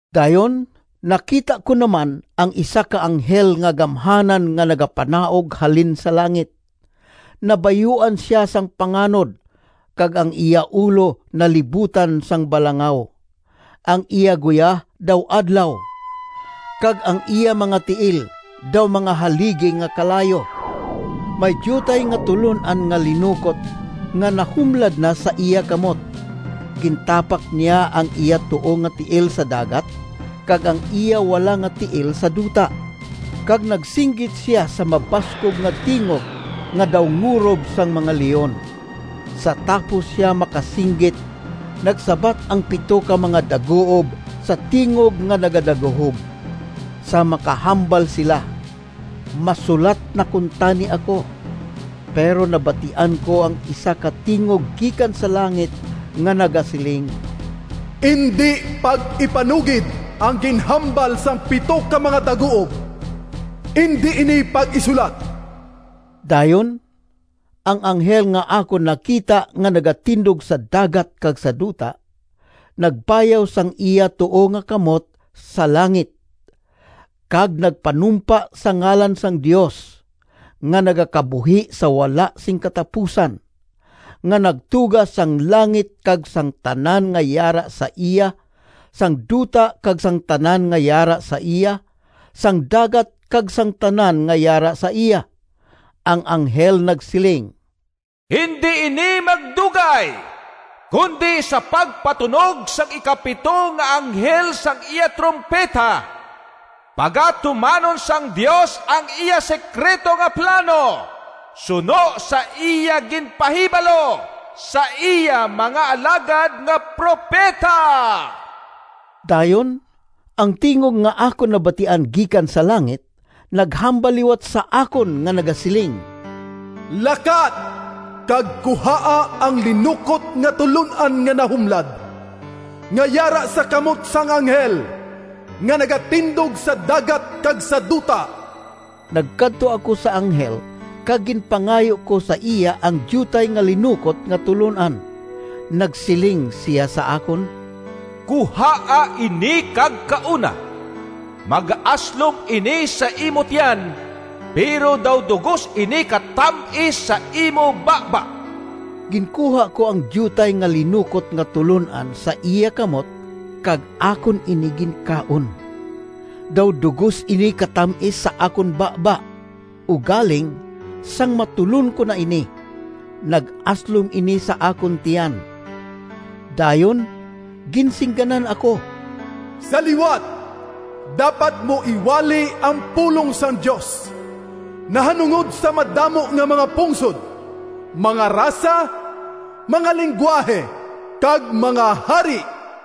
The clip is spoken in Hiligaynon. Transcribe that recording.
Dayon nakita ko naman ang isa ka anghel nga gamhanan nga nagapanaog halin sa langit. Nabayuan sia sang panganod, kag ang iya ulo nalibutan sang balangaw. Ang iya guya daw adlaw, kag ang iya mga tiil daw mga haligi nga kalayo. May diutay nga tulon-an nga linukot nga nahumlad na sa iya kamot. Gintapak niya ang iya tuo nga tiil sa dagat, kag ang iya wala nga tiil sa duta, kag nagsinggit sia sa mabaskog nga tingog nga daw ngurob sang mga leon. Sa tapos sia makasinggit, nagsabat ang pito ka mga daguob sa tingog nga nagadaguhob. Sang makahambal sila, masulat na kuntani ako, pero nabatian ko ang isa ka tingog gikan sa langit nga nagasiling, “Indi pag-ipanugid ang ginhambal sang pito ka mga daguob. Indi ini pag-isulat!” Dayon ang anghel nga akon nakita nga nagatindog sa dagat kag sa duta, nagbayaw sang iya tuo nga kamot sa langit kag nagpanumpa sa ngalan sang Dios, nga nagakabuhi sa wala sing katapusan, nga nagtuga sang langit kag sang tanan nga yara sa iya, sang duta kag sang tanan nga yara sa iya, sang dagat kag sang tanan nga yara sa iya. Ang anghel nagsiling, “Indi ini magdugay, kundi sa pagpatunog sang ikapito nga anghel sang iya trumpeta, pagatumanon sang Dios ang iya sekrito nga plano suno sa iya ginpahibalo sa iya mga alagad nga propeta.” Dayon ang tingog nga akon nabatian gikan sa langit naghambal liwat sa akon nga nagasiling, “Lakat kag kuhaa ang linukot nga tulon-an nga nahumlad, nga yara sa kamot sang anghel nga nagatindog sa dagat kag sa duta.” Nagkadto ako sa anghel kag ginpangayo ko sa iya ang diutay nga linukot nga tulon-an. Nagsiling sia sa akon, “Kuhaa ini kag kauna. Magaaslom ini sa imo tiyan, pero daw dugos ini katam-is sa imo baba.” Ginkuha ko ang diutay nga linukot nga tulon-an sa iya kamot kag akon ini ginkaon. Daw dugos ini katam-is sa akon baba, ugaling sang matulon ko na ini, nag-aslom ini sa akon tiyan. Dayon ginsingganan ako, “Sa liwat dapat mo iwali ang pulong sang Dios nahanungod sa madamo nga mga pungsod, mga rasa, mga linggwahe, kag mga hari.”